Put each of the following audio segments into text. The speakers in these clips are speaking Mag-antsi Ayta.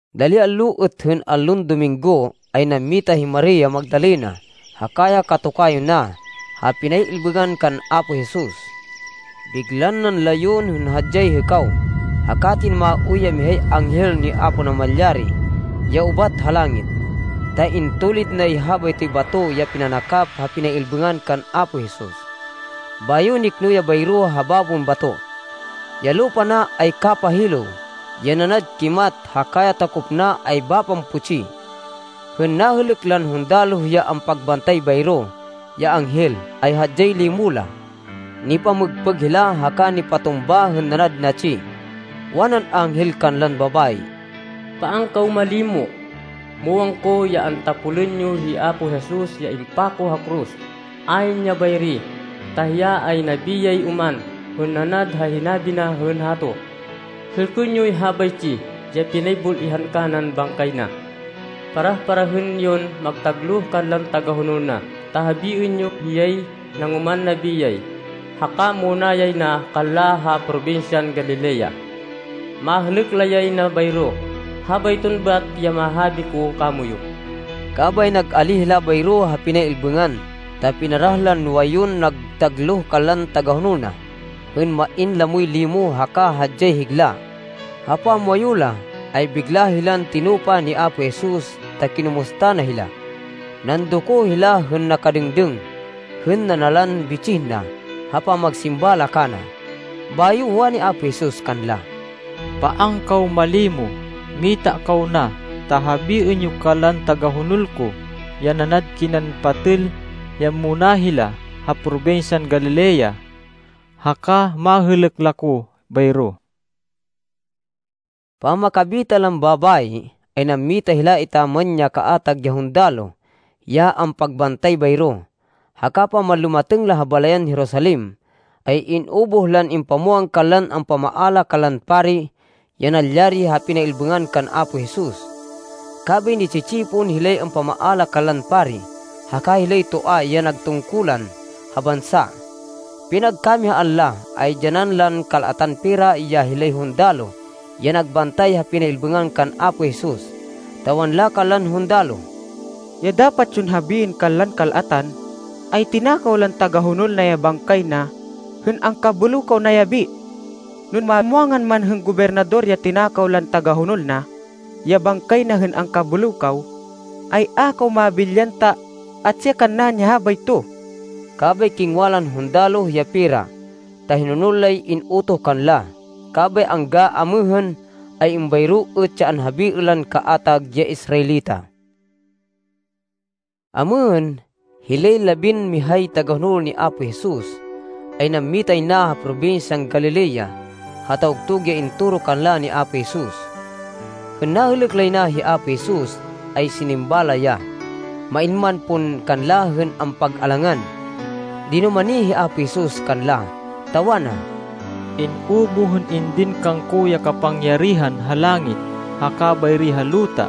Dali allo êt hên allon Dominggo, ay nammita hi Maria Magdalena haka ya katokayo na ha pinay-ilbêngan kan Apo Jesus. Biglan nanlayon hên hadyay hêkaw, haka tinumaoy ya mihay anghel ni Apo Namalyari ya ubat ha langit, ta intulid nay habaytoy bato ya pinanakap ha pinay-ilbêngan kan Apo Jesus, bayo nikno ya bayro ha babon bato. Ya lupa na ay kapahilêw ya nanad kimat haka ya takop na ay bapan putsi. Hên nahêlêk lan hundaloh ya ampagbantay bayro ya anghel, ay hadyay limo la. Nipamêgpêg hila haka nipatumba hên nanad natsi. Wanan anghel kanlan babayi, “Paan kaw malimo! Muwang ko ya antapolên yo hi Apo Jesus ya impako ha koros. Ayn ya bayri, ta hiya ay nabiyay oman hên nanad ha hinabi na hên hato! Hêlkên yoy habaytsi ya pinaybul-ihan kanan bangkay na. Parah-parahên yon magtagloh kanlan tagahonol na, ta habiên yo hiyay nangoman nabiyay, haka muna yay na kanla ha probinsyan Galilea. Mahêlêk la yay na bayro. Habayton bat ya mahabi ko kamoyu.” Kabay nag-alíh hila bayro ha pinay-ilbêngan ta pinarah lan nuwayun nagtagloh kanlan tagahonol na, hên main lamoy limo haka hadyay higla. Ha pamwayu la, ay bigla hilan tinupa ni Apo Jesus ta kinumusta na hila. Nandoko hila hên nakadêngdêng hên nanalan bitsih na ha pamagsimba la kana. Bayo wani Apo Jesus kanla, “Paan kaw malimo! Mita kaw na, ta habiên yo kanlan tagahonol ko, ya nanad kinan patêl, ya muna hila ha Probinsyan Galilea, haka mahêlêk la ko bayro.” Pamakabita lan babayi, ay nammita hila etaman ya kaatag ya hundaloh ya ampagbantay bayro, haka pamanlumatêng la ha balayan Jerusalem, ay in-ubuh lan impamwang kanlan ampamaala kanlan pari ya nalyari ha pinay-ilbêngan kan Apo Jesus. Kabay ni-tsi-tsipon hilay ampamaala kanlan pari haka hilay toa ya nag tungkulan ha bansa. Pinagkamihaan la, ay dyanan lan kal-atan pera ya hilay hundaloh ya nagbantay ha pinay-ilbêngan kan Apo Jesus, ta wanla kanlan hundaloh, “Ya dapat yon habiên kanlan kal-atan, ay tinakaw lan tagahonol na ya bangkay na hên angkabêlêw kaw nayabi. No mamwangan man hên Gobernador ya tinakaw lan tagahonol na, ya bangkay na hên angkabêlêw kaw, ay a kaw mabilyan ta atsi kannaên ya habayto.” Kabay kingwa lan hundaloh ya pera ta hinonol lay in-utoh kanla. Kabay angga amêhên ay êmbayro êt ya anhabiên lan kaatag ya Israelita. Amêhên, hilay labinmihay tagahonol ni Apo Jesus ay nammitay na ha probinsyan Galilea ha tawgtug ya intoro kanla ni Apo Jesus. Hên nahêlêk lay na hi Apo Jesus ay sinimba la ya, main man pon kanla hên ampag-alangan. Dinumani hi Apo Jesus kanla, ta wana, “In-ubuh hên indin kangko ya kapangyarihan ha langit haka bayri ha luta.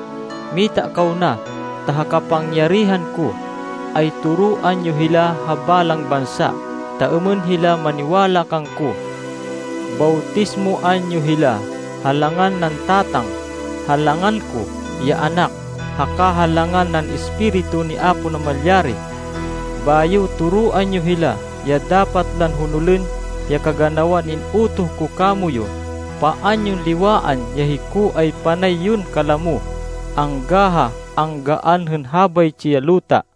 Mita kaw na ta ha kapangyarihan ko, ay toroan yo hila ha balang bansa ta êmên hila maniwala kangko. Bawtismoan yo hila ha langan nan Tatang, ha langan ko, ya Anak, haka ha langan nan Espiritu ni Apo Namalyari. Bayo toroan yo hila ya dapat lan honolên ya kaganawan in-utoh ko kamoyu. Paan yon liwaan ya hiko ay panay yon kalamo, angga ha anggaan hên habaytsi ya luta.”